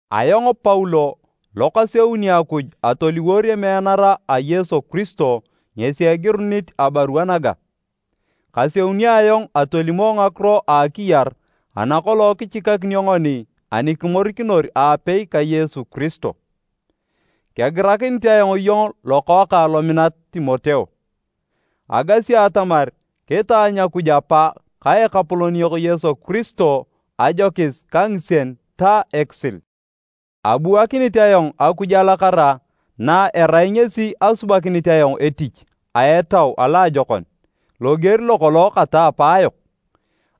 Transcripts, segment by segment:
Ayong Paulo lo kaseuni Akuj atoliwor emeanara a Yesu Kiristo ngesi egirunit abarua naga. Kaseunio ayong atolimo ngakiro a akiyar ana kolong kichikakinio ngoni ani kimorikinor aapei ka Yesu Kiristo. Kegirakinit ayong iyong lokookang lominat, Timoteo. Agasi atamar kitaanyu Akuj Apa ka Ekapolon yok Yesu Kiristo ajokis ka ngisien ta ekisil. Abuakinit ayong Akuj alakara na erai ngesi asubakinit ayong etich a etau aloajokon, loger lokolong kata apaayok.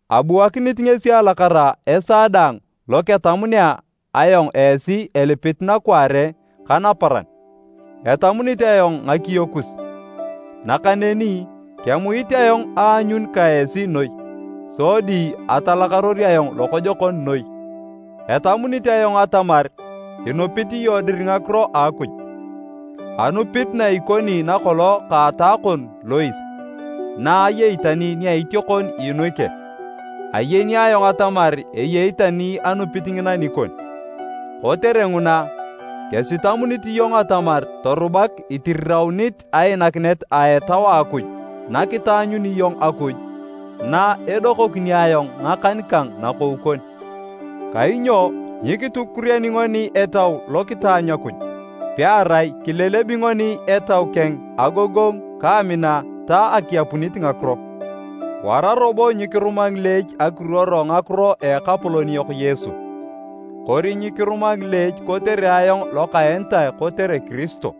Abuakinit ngesi alakara esaa daang lo ketamunea ayong esi elipit nakwaare ka naparan. Etamunit ayong ngakiyo kus, nakaneni kemuit ayong aanyun ka esi noi, sodi atalakaror ayong lokojokon noi. Etamunit ayong atamar inupit iyong dir ngakiro a Akuj, anupit na ikoni nakolong ka ataa kon Lois, na ayei tani nia itiokon Eunike. Ayeni ayong atamar eyei tani anupit ngina nikon. Kotere nguna, kesitamunit iyong atamar torubak itiriraunit ainakinet a Etau a Akuj nakitaanyuni iyong Akuj na edokokinio ayong ngakan kang nakou kon. Kainyo nyikitukuriani ngoni Etau lo kitaanyu Akuj, pearai kilelebi ngoni Etau keng agogongu ka amina ta akiapunit ngakiro. Wara robo nyikiruma ngileech akiruoro ngakiro a Ekapolon yok Yesu, kori nyikiruma ngileech kotere ayong lokaenitae kotere Kiristo.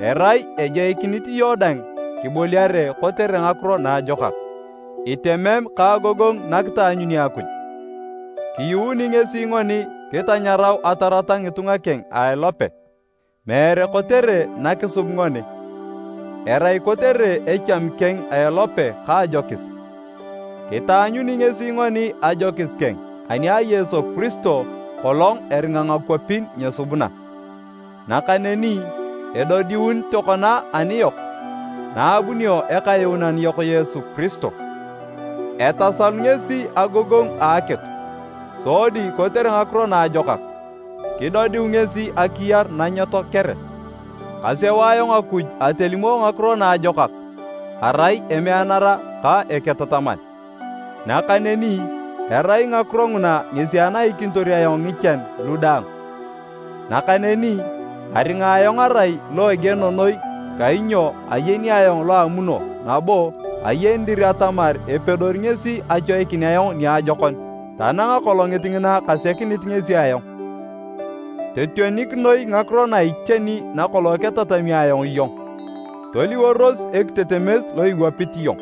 Erai ejoikinit iyong dang kiboliare kotere Ngakiro Naajokak, itemem ka agogongu nakitaanyuni Akuj. Kiyuuni ngesi ngoni kitanyarau atarata ngitunga keng a elope, meere kotere na kisub ngoni, erai kotere echami keng a elope ka ajokis. Kitaanyuni ngesi ngoni ajokis keng ani a Yesu Kiristo kolong eringa ngakwapin nyesubuna, nakaneni edodiun tokona aniyok na abunio Ekayuunan yok Yesu Kiristo. Etasalu ngesi agogongu a akitu sodi kotere ngakiro naajokak, kidodiu ngesi akiyar na nyetoakere. Kaseu ayong Akuj atolimo Ngakiro Naajokak arai emeanara ka eketataman, nakaneni erai ngakiro nguna ngesi anaikinitor ayong ngichan lu daang. Nakaneni aringa ayong arai lo egieno noi kainyo ayeni ayong lo amuno nabo ayeni dir atamar epedori ngesi achoikin ayong niajokon tanang Akolongit ngina kasekinit ngesi ayong. Totionik noi ngakiro na iteni nakolong ketatami ayong iyong, toliworos ekitetemes lo iwapit iyong,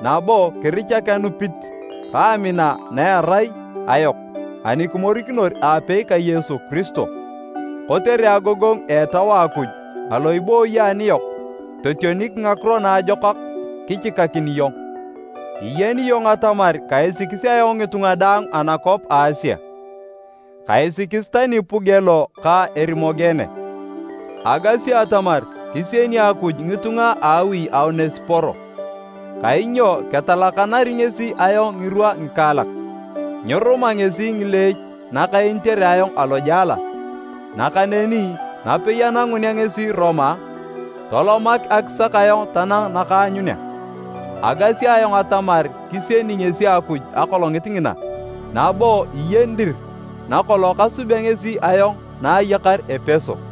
nabo kirichak anupit ka amina na erai ayok ani kimorikinor aapei ka Yesu Kiristo. Kotere agogongu a Etau a Akuj alo ibooyi aniyok totionik ngakiro naajokak kichikakin iyong. Iyeni iyong atamar kaisikis ayong ngitunga daang anakwap a Asia, kaisikis tani Pugelo ka Erimogene. Agasi atamar kisieni Akuj ngitunga a awi a Onesiporo, kainyo ketalakanari ngesi ayong ngirwa ngikaalak. Nyiruma ngesi ngileech nakaenitere ayong alojela, nakaneni napei anangunea ngesi Roma, tolomak akisak ayong tanang nakaanyunea. Agasi ayong atamar kisieni ngesi Akuj Akolongit ngina! Nabo iyeni dir nakolong kasubea ngesi ayong na ayakar Epeso.